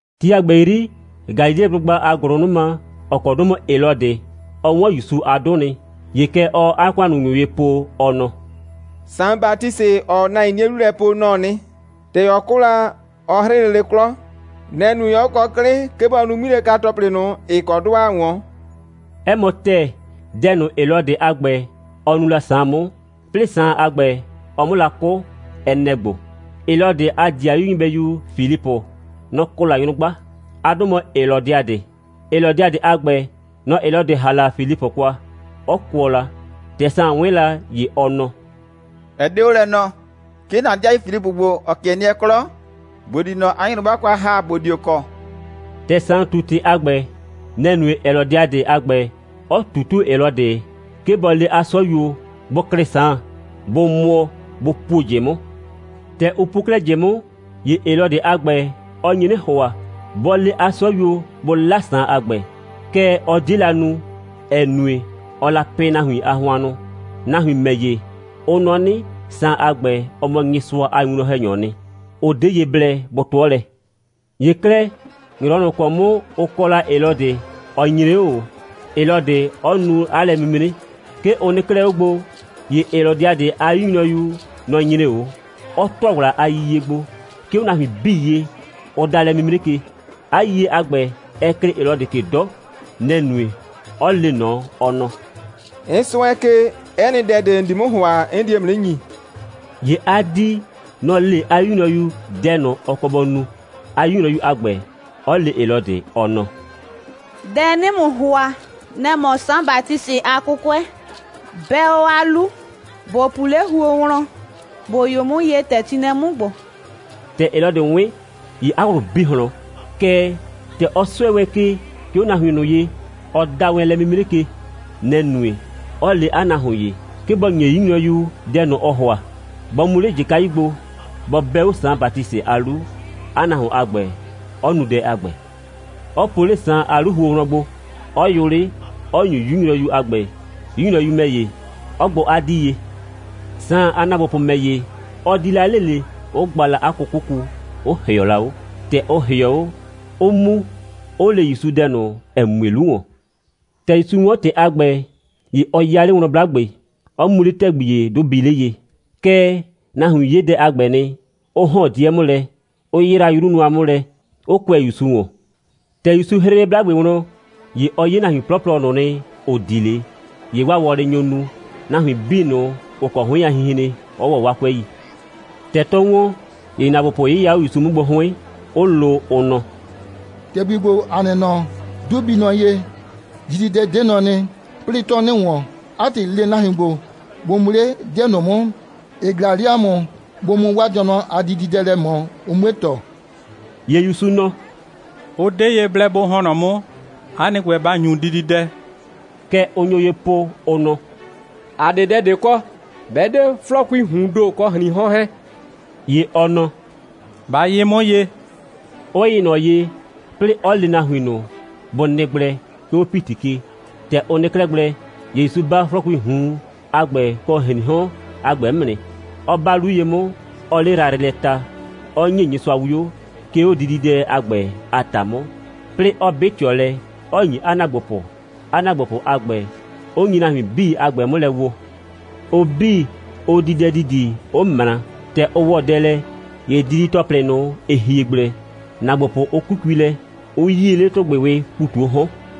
Ti a ‑gbɛ 'yri, Galileblʋgba a ‑gʋlʋnʋma, ‑ɔ kɔ 'dʋ mɔ Helɔdɩ, ɔ 'wɔn ‑Yusu a 'dʋ nɩ. ‑Ye kɛ ɔɔ 'a ‑kʋannunyʋ ye po, ɔ nɔ: «Saan Batisɩ, ‑ɔɔ o nahuin 'nie 'lu lɛ po, nɔ‑ɔ nɩ. ‑Tɛ ɔ 'kʋ la, ɔ 'hrɩ lele 'klɔ. Nɛ‑ nue, 'ɔ kɔ 'klɩ, 'ke bɔ nu 'ŋmilɛka‑tɔplɩ ꞊nʋ, ‑ɩ kɔ 'dʋ ‑aa 'wɔn.» 'Ɛ mɔ ‑tɛɛ, dɛ ꞊nʋ, Helɔdɩ a ‑gbɛ, ɔ nu la Saan 'mʋ, 'plɩɩ Saan a ‑gbɛ, ɔ 'mʋ la 'kʋ, ɛ nɛ‑ ‑gbo: Helɔdɩ a ‑dɩayu nyɩbɛyu Filipʋ, nɔ‑ kɔ la nyrʋgba. 'A 'dʋ mɔ Helɔdiadɩ. Helɔdiadɩ a ‑gbɛ, nɔ‑ Helɔdɩ ‑ha la Filipʋ kwa, 'ɔ kʋɔ la. ‑Tɛ Saan 'wɩn la, ‑ye ɔ nɔ: «Ɛ 'de 'o lɛ nɔɔ, 'ke ‑na ‑dɩayu Filipʋ ‑gbo, ‑ɔ 'kɩɛ nɩɛ 'klɔ, ‑bo di ꞊nɔ 'a nyrʋgba kwa ‑ha, ‑bo dio kɔ.» ‑Tɛ Saan ꞊tu ‑tɩ a ‑gbɛ, nɛ‑ nue Helɔdiadɩ a ‑gbɛ, 'ɔ ꞊tutuo Helɔdɩ, 'ke bɔ le 'a 'sɔyuo, bʋ klɩ Saan, bʋ mʋɔ, bʋ puo ꞊jɩ 'mʋ. ‑Tɛ ʋ puo 'klɛɛ ꞊jɩ 'mʋ, ‑ye Helɔdɩ a ‑gbɛ, ɔ nye 'nɩ ‑hʋa, bɔ le 'a 'sɔyuo, bʋ 'la Saan a ‑gbɛ. Kɛɛ, ɔ 'die la nu, ‑ɛ nue, ɔɔ la pɩ nahuin a hʋannʋ. Nahuin ‑mɛ ‑ye, ʋ nɔ 'nɩ, Saan a ‑gbɛ, ɔ mɔ Nyɩsʋa a winwlɔn‑hɛnyɔɔ nɩ. Ʋ 'de ye blɛ bʋ 'tʋɔ lɛ. ‑Ye 'klɛɛ, ‑nyrɔwɔ ꞊nʋ ‑kɔ 'mʋ ʋ kɔ la Helɔdɩ, ɔ nyre 'o ꞊o, Helɔdɩ 'ɔ nu 'a lɛ'mimre. 'Ke ʋ nɩ 'klɛɛ 'o gbo, ‑ye Helɔdiadɩ a 'yu nyrɔyu, nɔ‑ nyre 'o, 'ɔ ‑tʋa ‑wla a yiyie gbo, 'ke 'o nahuin 'bii ye, ʋ da lɛ'mimre ke. 'A yiyie a ‑gbɛ, ɛ klɩɩ Helɔdɩ ke 'dɔ. Nɛ‑ nue, 'ɔ le ꞊nɔ, ɔ nɔ: «'N 'sʋɛ ke, 'ɛ nɩ dɛ ꞊de, ‑n di 'mʋ ‑hʋa, 'n die ‑mʋ 'nɩ ‑nyi.» ‑Ye 'a 'dii, nɔ‑ le 'a 'yu nyrɔyu dɛ ꞊nʋ, ɔ kɔ bɔ nu, 'a 'yu nyrɔyu a ‑gbɛ, 'ɔ le Helɔdɩ, ɔ nɔ: «Dɛ 'nɩɩ ‑mʋ ‑hʋa, nɛ‑ mɔ Saan Batisɩ a 'kʋkʋɛ. 'Bɛ 'o 'a 'lu, ‑bo pu 'le huo wlɔn, ‑bo yʋ 'mʋ ye, ‑tɛ ti nɩ lɛ 'mʋ ‑gbo.» ‑Tɛ Helɔdɩ 'wɩn, ‑ye 'a ꞊wlʋ bi ꞊hlɔn. Kɛɛ, ‑tɛ ɔ 'sʋɛ wɛn ke, 'ke 'o nahuin ꞊nʋ ye, ɔ da wɛn lɛ'mimre ke, nɛ‑ nue, 'ɔ le 'a nahuon ‑ye, 'ke bɔ ‑nye 'yu nyrɔyu dɛ ꞊nʋ, ɔɔ ‑hʋa, bɔ mu 'le ꞊jɩkayu gbo, bɔ 'bɛ 'o Saan Batisɩ a 'lu, 'a nahuon a ‑gbɛ, 'ɔ nu dɛ a ‑gbɛ, 'ɔ po 'le Saan a 'lu huo wlɔn gbo, 'ɔ yʋ 'le, 'ɔ ‑nyu 'yu nyrɔyu a ‑gbɛ, 'yu nyrɔyu ‑mɛ ‑ye, 'ɔ gbʋ 'a 'dii ye. Saan a ‑naagbopʋ ‑mɛ ‑ye, ʋ di la 'le ꞊le, 'ʋ gba la 'a 'kʋkʋku, 'ʋ ‑hɩɔ la 'o. ‑Tɛ ʋ ‑hɩɔ 'o, 'ʋ mu, 'ʋ le ‑Yusu dɛ ꞊nʋ, ‑ɛ mue 'lu ‑wɔn. ‑Tɛ ‑Yusu 'wɔn ‑tɩ a ‑gbɛ, ‑ye ɔ 'ya 'le wlɔn 'blagbe, 'ɔ mu 'le ‑tɛgbi ‑ye, 'dʋ bii 'le ye. Kɛɛ, nahuin 'ye dɛ a ‑gbɛ nɩ, 'ʋ ‑hɔn 'dɩɛ 'mʋ lɛ, 'ʋ 'yraa 'yru nʋa 'mʋ lɛ, 'ʋ kʋɛ ‑Yusu ‑wɔn. ‑Tɛ ‑Yusu 'hrɩ 'le 'blagbe wlɔn, ‑ye ɔ 'ye nahuin 'plɔplɔ ꞊nʋ nɩ, ‑ʋ di 'le. ‑Ye 'waa wɔlɩ nyo nu, nahuin 'bii ꞊nʋ, ‑ʋ kɔ 'hʋɩn a hinhren, 'ɔ ‑wɔ 'waa 'kʋɛi. ‑Tɛ 'tɔɔ ‑wɔn, ‑ye ‑naagbopʋ 'yɩya 'o ‑Yusu 'mʋ gbo 'hʋɩn, 'ʋ lo, ʋ nɔ: «‑Tɛgbi ‑gbo, ‑a nɩ nɔ, 'dʋ bii nɔ ye, dididɛ 'de nɔ nɩ, 'plɩɩ, 'tɔɔ 'nɩ ‑wɔn. 'A ‑tɩ, le nahuin ‑gbo, bʋ mu 'le 'dɩɛ ꞊nʋ 'mʋ, ‑ɩ ꞊glaa 'le ‑a mʋ, bʋ mu 'waa dɩɔnʋ a dididɛ lɛ ꞊mɔ, ʋ 'mue ‑tɔ!» ‑Ye ‑Yusu nɔ: «Ʋ 'de ye blɛ bʋ ‑hɔn nɔ 'mʋ. 'A nɩ ‑gbɛ, ba ‑nyu dididɛ!» Kɛ ʋ nyo ye po, ʋ nɔ: «‑A 'de dɛ ꞊de kɔ, 'bɛ 'de 'flɔɔkuii ꞊huun ‑do, kɔ ‑hriin 'hɔn 'hɛɛn.» ‑Ye ɔ nɔ: «Ba yɩ 'mʋ ye!» 'ʋ yɩ ꞊nɔ ye, 'plɩɩ 'ɔ le nahuin ꞊nʋ, bʋ nɩ gblɛ, 'ke 'o ‑piti ke. ‑Tɛ ʋ nɩ 'klɛɛ gblɛ, ‑ye ‑Yusu 'ba 'flɔɔkuii ꞊hun a ‑gbɛ kɔ ‑hriin 'hɔn a ‑gbɛ 'mʋ nɩ, 'ɔ 'ba 'lu ye 'mʋ, 'ɔɔ 'le yrayrɩ lɛ ta, 'ɔ ‑nye Nyɩsʋa 'wio, 'ke 'o dididɛ a ‑gbɛ a ‑ta 'mʋ, 'plɩɩ 'ɔ 'bɩ ꞊tɩɔ lɛ, 'ɔ ‑nyi 'a ‑naagbopʋ, 'a ‑naagbopʋ a ‑gbɛ, 'ʋ nyi nahuin 'bii a ‑gbɛ 'mʋ lɛ woo. Ʋ 'bii, ʋ di dɛ ‑didi, 'ʋ ꞊mra. ‑Tɛ ʋ ‑wɔ dɛ lɛ, ‑ye didi‑tɔplɩ ꞊nʋ, ‑ɩ hie gblɛ, ‑naagbopʋ, ʋ 'kukui lɛ, 'ʋ 'yie 'le ‑tʋgbɩwɩɩ ‑pu ꞊tu 'o 'hɔn.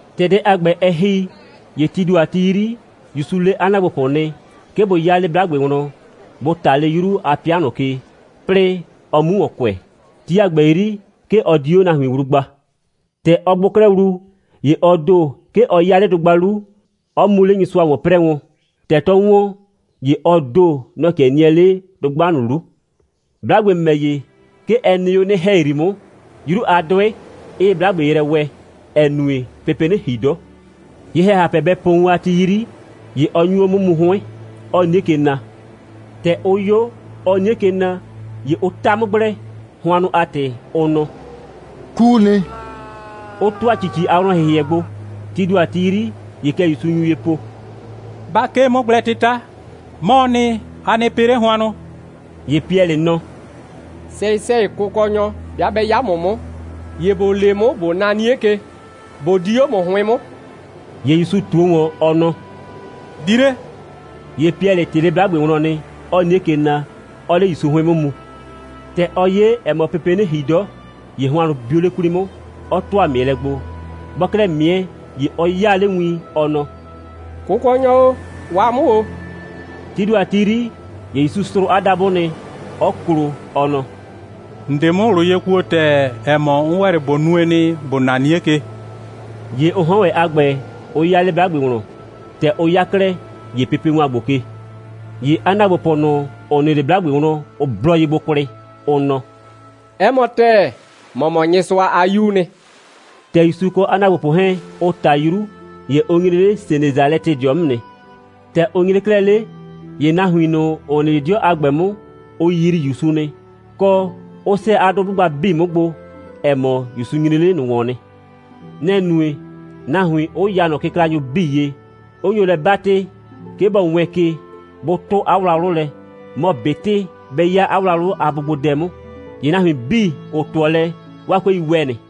‑Tɛ dɛ a ‑gbɛ, ɛ ‑hi, ‑ye tii ‑do a ti 'yri, ‑Yusu le 'a ‑naagbopʋ nɩ, 'ke bʋ 'ya 'le 'blagbe wlɔn, bʋ ꞊ta 'le 'yru a 'pɩa ꞊nʋ ke, 'plɩɩ ɔ 'mu ‑wɔn kʋɛ. Ti a ‑gbɛ 'yri, 'ke ɔ di 'o nahuin wlu gba. ‑Tɛ ɔ gbʋ 'klɛɛ wlu, ‑ye ɔ ‑do, 'ke ɔ 'ya 'le dʋgba 'lu, 'ɔ mu 'le Nyɩsʋa ‑wɔn 'prɛɛ wɔn. ‑Tɛ 'tɔ ‑wɔn, ‑ye ɔ ‑do, nɔ‑ 'kɩɛ nɩɛ 'le dʋgba ꞊nʋ 'lu. 'Blagbe ‑mɛ ‑ye, 'ke ɛ nɩ 'o 'nɩ‑hɛyri 'mʋ, 'yru a 'dʋɩ 'ɩɩ 'blagbe yrɛ wɛɛ, ‑ɛ nue, pepee 'nɩ ‑hi 'dɔ. Ye‑hɛhapɛ bɛ po wun a ti 'yri, ‑ye ɔ nyu 'o 'mʋ mu 'hʋɩn, 'ɔɔ 'nie ke na. ‑Tɛ ʋ 'yo, ɔɔ 'nie ke na, ‑ye ʋ 'ta 'mʋ gblɛ, hʋannʋ a ‑tɩ, ʋ nɔ: «'Kuu nɩ,» 'ʋ ‑tʋa ‑cici a wlɔn‑hɩhɩɛ gbo. Tii ‑do a ti 'yri, ‑ye kɛ ‑Yusu nyu ye po: «Ba 'kee 'mʋgblɛ'tɩta. 'Mɔɔ nɩ. A nɩ pɩ 'le hʋannʋ!» ‑Ye Piɛlɩ nɔ: «Sɛyɩ‑sɛyɩ, Kʋkɔnyɔ, 'bɩa 'bɛ 'ya ‑mʋ 'mʋ, ‑ye ‑bo le 'mʋ, ꞊bo na 'nie ke, ꞊bo di 'o ‑mʋ 'hʋɩn 'mʋ.» ‑Ye ‑Yusu ꞊tuo ‑wɔn, ɔ nɔ: «Di 'le!» ‑Ye Piɛlɩ ꞊tɩɩ 'le 'blagbe wlɔn, 'ɔɔ 'nie ke na, 'ɔɔ 'le ‑Yusu 'hʋɩn 'mʋ mu. ‑Tɛ ɔ 'ye, ‑ɛ mɔ, pepee 'nɩ ‑hi 'dɔ, ‑ye hʋannʋ bio 'le 'kwli 'mʋ, 'ɔ ‑tʋa ꞊mɩɛlɛ gbo. Bɔɔ 'klɛɛ ꞊mɩɛ, ‑ye ɔ 'yaa 'le win, ɔ nɔ: «Kʋkɔnyɔ o, waa 'mʋ ‑o!» Tii ‑do a ti 'yri, ‑ye ‑Yusu srʋʋ 'a dabʋ nɩ, 'ɔ klo, ɔ nɔ: «‑N 'de 'mʋ ꞊wlʋ ye kuo ‑tɛɛ, ‑ɛ mɔ, 'n ‑wɛ 'le ꞊bo nue nɩ, ‑bo na 'nie ke nɩ.» ‑Ye ʋ 'hɔn ‑wɛ a ‑gbɛ, ʋ 'ya 'le 'blagbe wlɔn. ‑Tɛ ʋ 'ya 'klɛɛ, ‑ye pepe ‑wan gbo ke. ‑Ye 'a ‑naagbopʋ ꞊nʋ, ‑ʋ nɩ 'le 'blagbe wlɔn, ʋ blɔ ye gbo kwlɩ, ʋ nɔ: «'Ɛ mɔ ‑tɛɛ, ‑mɔ mɔ Nyɩsʋa a 'Yuu nɩ.» ‑Tɛ ‑Yusu kɔ 'a ‑naagbopʋ 'hɛɛn, ʋ ꞊ta 'yru, ‑ye ʋ nyre 'le Senesalɛtɩdɩɔ 'mʋ nɩ. ‑Tɛ ʋ nyre 'klɛɛ 'le, ‑ye nahuin ꞊nʋ, ‑ʋ nɩ 'le 'dɩɔ a ‑gbɛ 'mʋ, ʋ yrii ‑Yusu nɩ, kɔ, 'ʋ 'sɛɛ 'a 'dʋ 'blʋgba 'bii 'mʋ gbo, ‑ɛ mɔ, ‑Yusu nyre 'le ꞊nʋ ‑wɔn nɩ. Nɛ‑ nue, nahuin 'ʋ ya ꞊nɔ kɩklanyʋ 'bii ye, 'ʋ nyo lɛ 'batɩ, 'ke bɔ wɛɛn ke, bʋ 'tʋ 'a wlawlʋ lɛ, mɔ ꞊betɩ bɛ 'ya 'a wlawlʋ a bʋgbodɛ 'mʋ. ‑Ye nahuin 'bii, ‑ʋ 'tʋɔ lɛ, 'waa 'kʋɛi ‑wɛ nɩ.